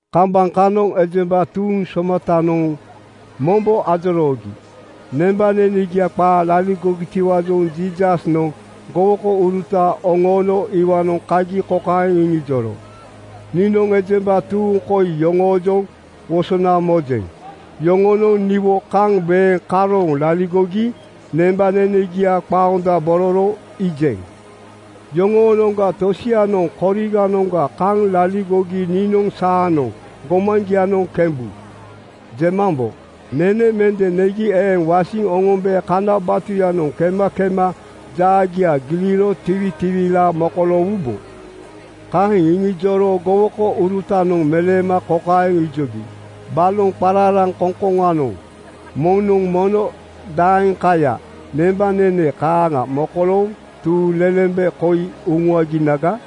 Kambaŋ kanoŋ ejemba tuuŋ somatanoŋ mombo ajoroogi. Nembanenegia qaa laligogitiwaajoŋ Jiisasnoŋ gowokouruta oŋoono iwaanoŋ kagi kokaeŋ iŋijoro, “Niinoŋ ejemba tuuŋ koi yoŋoojoŋ wosona mojeŋ. Yoŋonoŋ niwo kaŋ weeŋ karooŋ laligogi nembanenegia qaondabororo iijeŋ. Yoŋoonoŋga tosianoŋ koriganoŋga kaŋ laligogi niinoŋ ‘Saanoŋ gomaŋgianoŋ kembu,’ jemambo. Nene mende negi eeŋ wasiŋ oŋombe kana batuyanoŋ kema kema jaagia giliro tiwitiwilaa mokoloowubo.” Kaeŋ iŋijoro gowokourutanoŋ meleema kokaeŋ ijogi. “Baloŋ qararaŋkoŋkoŋanoŋ kokanoŋ moŋnoŋ mono daeŋkaya nembanene kaaŋa mokolooŋ tuuŋlelembe koi uŋuaginaga?”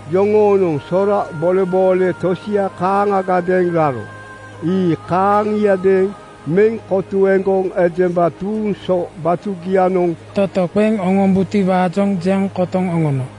Yoŋoonoŋ sora boleboole tosia kaaŋagadeeŋ raro. Ii kaaŋiadeeŋ meŋ kotuegoŋ ejemba tuuŋ so batugianoŋ toto qeŋ oŋombutiwaajoŋ jeŋ kotoŋ oŋono.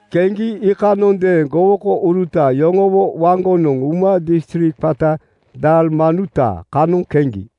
Keŋgi iikanondeeŋ gowokouruta yoŋowo waŋgonoŋ uma distrik qata Dalmanuta kanoŋ keŋgi.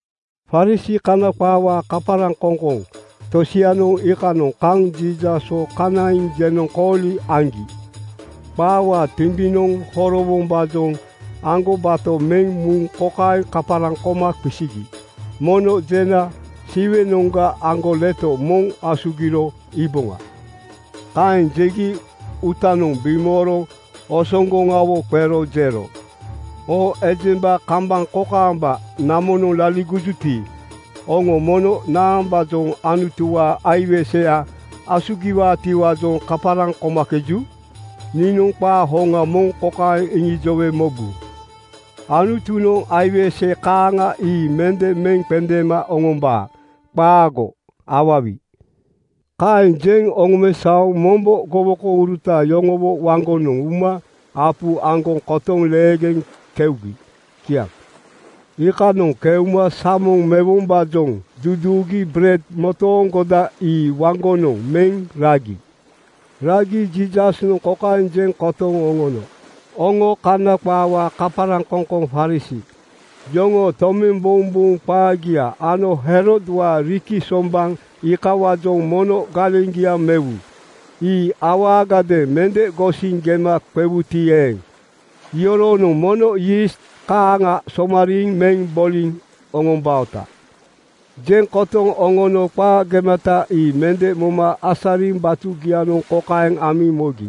Farisii (Kana qaawaa kaparaŋkoŋkoŋ) tosianoŋ iikanoŋ kaŋ Jiisaswo kanaiŋ jenoŋkooli aŋgi. Qaawaa timbinoŋ horowombaajoŋ aŋgobato meŋ muŋ kokaeŋ kaparaŋ koma qisigi, “Mono jena Siwenoŋga aŋgoleto moŋ asugiro iiboŋa.” Kaeŋ jegi uutanoŋ bimooro osoŋgoŋawo qero jero, “Oo ejemba kambaŋ kokaamba namonoŋ laligojuti, oŋo mono naambaajoŋ Anutuwaa aiwese asugiwaatiwaajoŋ kaparaŋ komakeju? Niinoŋ qaa hoŋa moŋ kokaeŋ iŋijowe mobu: Anutunoŋ aiwese kaaŋa ii mende meŋ qendeema oŋombaa. Qaago awawi!” Kaeŋ jeŋ oŋomesaoŋ mombo gowokouruta yoŋowo waŋgonoŋ uma apu aŋgoŋ kotoŋ leegeŋ keugi. Kiaŋ. Iikanoŋ keuma samoŋ mewombaajoŋ duduugi bered motooŋgoda ii waŋgonoŋ meŋ ragi. Ragi Jiisasnoŋ kokaeŋ jeŋ kotoŋ oŋono, “Oŋo Kana qaawaa kaparaŋkoŋkoŋ (Farisii) yoŋoo tomembouŋbouŋ qaagia ano Herodwaa riki sombaŋ iikawaajoŋ mono galeŋgia mewu. Ii awaagadeeŋ mende gosiŋ gema qewuti eeŋ, iyoronoŋ mono yiist kaaŋa somariiŋ meŋ boliŋ oŋombaota.” Jeŋ kotoŋ oŋono qaa gemata ii mende moma asariŋ batugianoŋ kokaeŋ amiŋ mogi.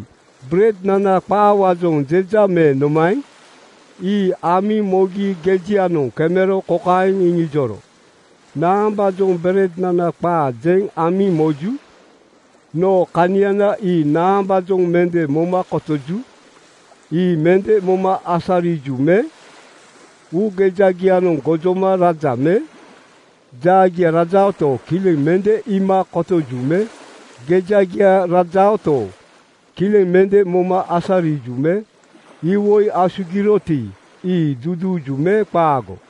“Berednana qaawaajoŋ jeja me nomaeŋ?” Ii amiŋ mogi gejianoŋ kemero kokaeŋ iŋijoro, “Naambaajoŋ berednana qaa jeŋ amiŋ moju? Noo kaniana ii naambaajoŋ mende moma kotoju? Ii mende moma asariju me? Uugejagianoŋ gojoma raja me? Jaagia rajaoto, kileŋ mende iima kotoju me? Gejagia rajaoto, kileŋ mende moma asariju me? Iwoi asugiroti, ii duduuju me qaago?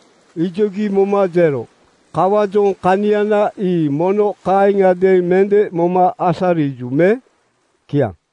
Ijogi moma jero, “Kawaajoŋ kaniana ii mono kaaŋiadeeŋ mende moma asariju me?” Kiaŋ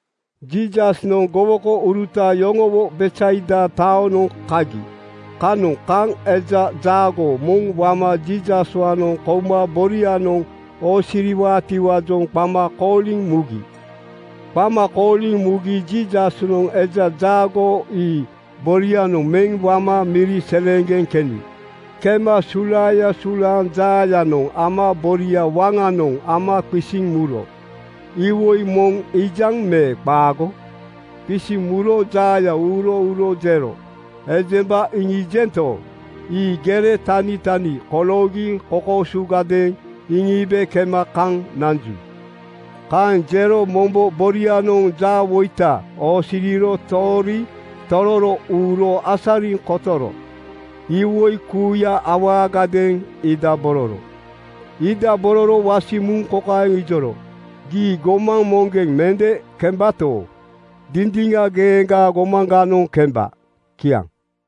Jiisasnoŋ gowokouruta yoŋowo Betsaida taonoŋ kagi. Kanoŋ kaŋ eja jaagoo moŋ wama Jiisaswaanoŋ kouma borianoŋ oosiriwaatiwaajoŋ qama kooliŋ mugi. Qama kooliŋ mugi Jiisasnoŋ eja jaagoo ii borianoŋ meŋ wama miri seleeŋgeŋ keni. Kema sulaaya sulaaŋ jaayanoŋ ama boria waŋanoŋ ama qisiŋ muro, “Iwoi moŋ iijaŋ me qaago?” Qisiŋ muro jaaya uuro uro jero, “Ejemba iŋiijento, ii gere tanitani koloogi kokoosugadeeŋ iŋiibe kema kaŋ nanju.” Kaeŋ jero mombo borianoŋ jaawoita oosiriro toori tororo uuro asariŋ kotoro iwoi kuuya awaagadeeŋ iidabororo. Iidabororo wasiŋ muŋ kokaeŋ ijoro, “Gii gomaŋ moŋgeŋ mende kembato, dindiŋa geeŋgaa gomaŋganoŋ kemba.” Kiaŋ.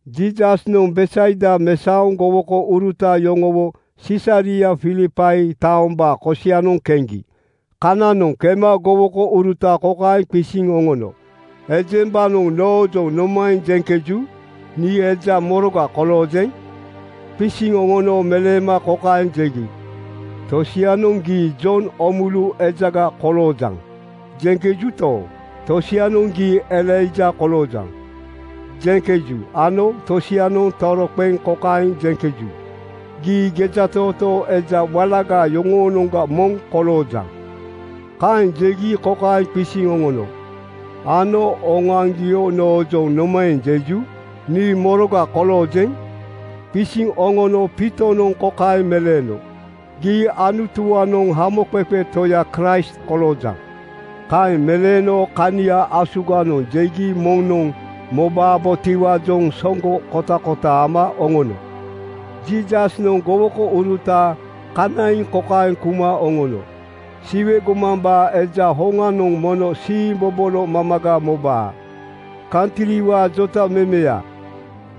Jiisasnoŋ Betsaida mesaoŋ gowokouruta yoŋowo Sisaria Filipai taombaa kosianoŋ keŋgi. Kananoŋ kema gowokouruta kokaeŋ qisiŋ oŋono, “Ejembanoŋ noojoŋ nomaeŋ jeŋkeju? Nii eja moroga koloojeŋ?” Qisiŋ oŋono meleema kokaeŋ jegi, “Tosianoŋ ‘Gii Jon Oomulu ejaga koloojaŋ,’ jeŋkejuto, tosianoŋ ‘Gii Elaija koloojaŋ,’ ‘jeŋkeju ano tosianoŋ toroqeŋ kokaeŋ jeŋkeju, ‘Gii gejatootoo eja walaga yoŋoonoŋga moŋ koloojaŋ.’” Kaeŋ jegi kokaeŋ qisiŋ oŋono, “Ano oŋoaŋgio noojoŋ nomaeŋ jeju? Nii moroga koloojeŋ?” Qisiŋ oŋono Piitonoŋ kokaeŋ meleeno, “Gii Anutuwaanoŋ Hamoqeqe Toya Kraist koloojaŋ.” Kaeŋ meleeno kania asuganoŋ jegi moŋnoŋ mobabotiwaajoŋ soŋgo kotakota ama oŋono. Jiisasnoŋ gowokouruta kanaiŋ kokaeŋ kuma oŋono, “Siwe gomambaa Eja hoŋanoŋ mono siimbobolo mamaga mobaa. Kantriwaa jotamemeya,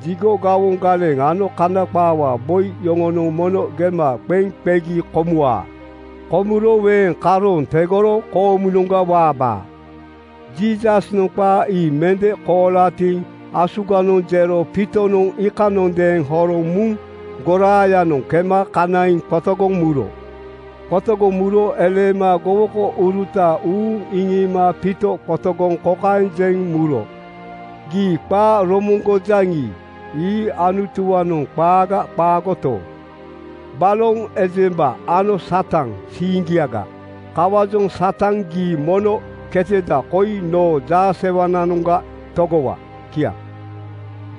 jigo gawoŋ galeŋ ano Kana qaawaa boi yoŋonoŋ mono gema qeŋ qegi komuwaa. Komuro weeŋ karooŋ tegoro koomunoŋga waabaa.” Jiisasnoŋ qaa ii mende kolatiŋ asuganoŋ jero Piitonoŋ iikanondeeŋ horoŋ muŋ goraayanoŋ kema kanaiŋ qotogoŋ muro. Qotogoŋ muro eleema gowokouruta uuŋ iŋiima Piito qotogoŋ kokaeŋ jeŋ muro, “Gii qaa romoŋgojaŋi, ii Anutuwaanoŋ qaaga qaagoto, baloŋ ejemba ano Satan siiŋgiaga. Kawaajoŋ Satan, gii mono keteda koi noo jaasewananoŋga togowa.” Kiaŋ.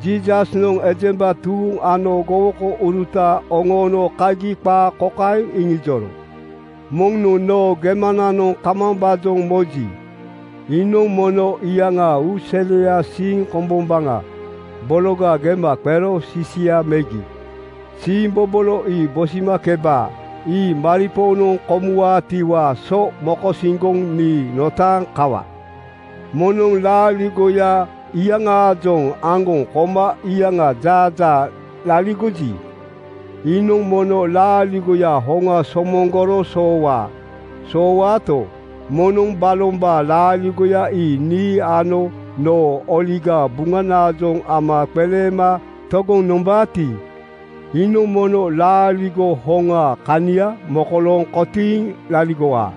Jiisasnoŋ ejemba tuuŋ ano gowokouruta oŋoono kagi qaa kokaeŋ iŋijoro, “Moŋnoŋ noo gemananoŋ kamambaajoŋ moji, iinoŋ mono iyaŋaa uuseliaa siiŋ kombombaŋa bologa gema qero sisia megi siimbobolo ii bisimakeba. Ii maripoonoŋ komuwaatiwaa so mokosiŋgoŋ nii notaaŋ kawa. Moŋnoŋ laaligoya iyaŋaajoŋ aŋgoŋ koma iyaŋaa jaajaa laligoji, iinoŋ mono laaligoya hoŋa somoŋgoro soowaa. Soowaato, moŋnoŋ balombaa laaligoya ii nii ano noo Oligaa Buŋanaajoŋ ama qeleema togoŋ nombaati, iinoŋ mono laaligo hoŋaa kania mokolooŋ kotiiŋ laligowaa.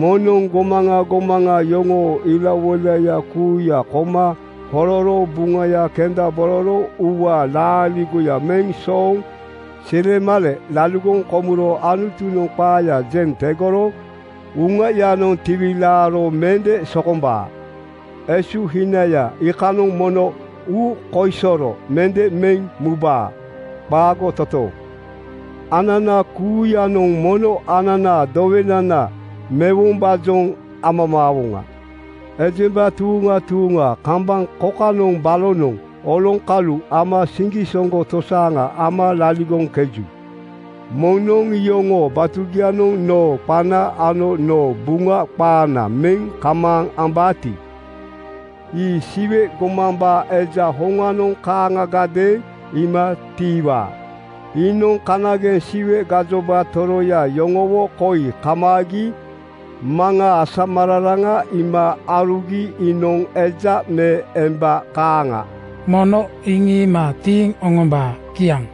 Moŋnoŋ gomaŋa gomaŋa yoŋoo ilawoilaya kuuya koma hororo buŋaya kendabororo uuwaa laaligoya meŋ sooŋ silemale laligoŋ komuro Anutunoŋ qaaya jeŋ tegoro uŋayanoŋ tiwilaaro mende sokombaa. Esuhinaya iikanoŋ mono uukoisoro mende meŋ mubaa. Qaago totooŋ! Anana kuuyanoŋ mono ananaa dowenana mewombaajoŋ amamaawoŋa. Ejemba tuuŋa tuuŋa kambaŋ kokanoŋ balonoŋ oloŋkalu ama siŋgisoŋgo tosaaŋa ama laligoŋkeju. Moŋnoŋ iyoŋoo batugianoŋ noo qana ano noo Buŋa qaana meŋ kamaaŋ ambaati, ii Siwe gomambaa Eja hoŋanoŋ kaaŋagadeeŋ iima tiiwaa. Iinoŋ kanageŋ Siwe gajoba toroya yoŋowo koi kamaagi Maŋaa asamararaŋa iima aarugi iinoŋ eja me emba kaaŋa mono iŋiima tiiŋ oŋombaa.” Kiaŋ.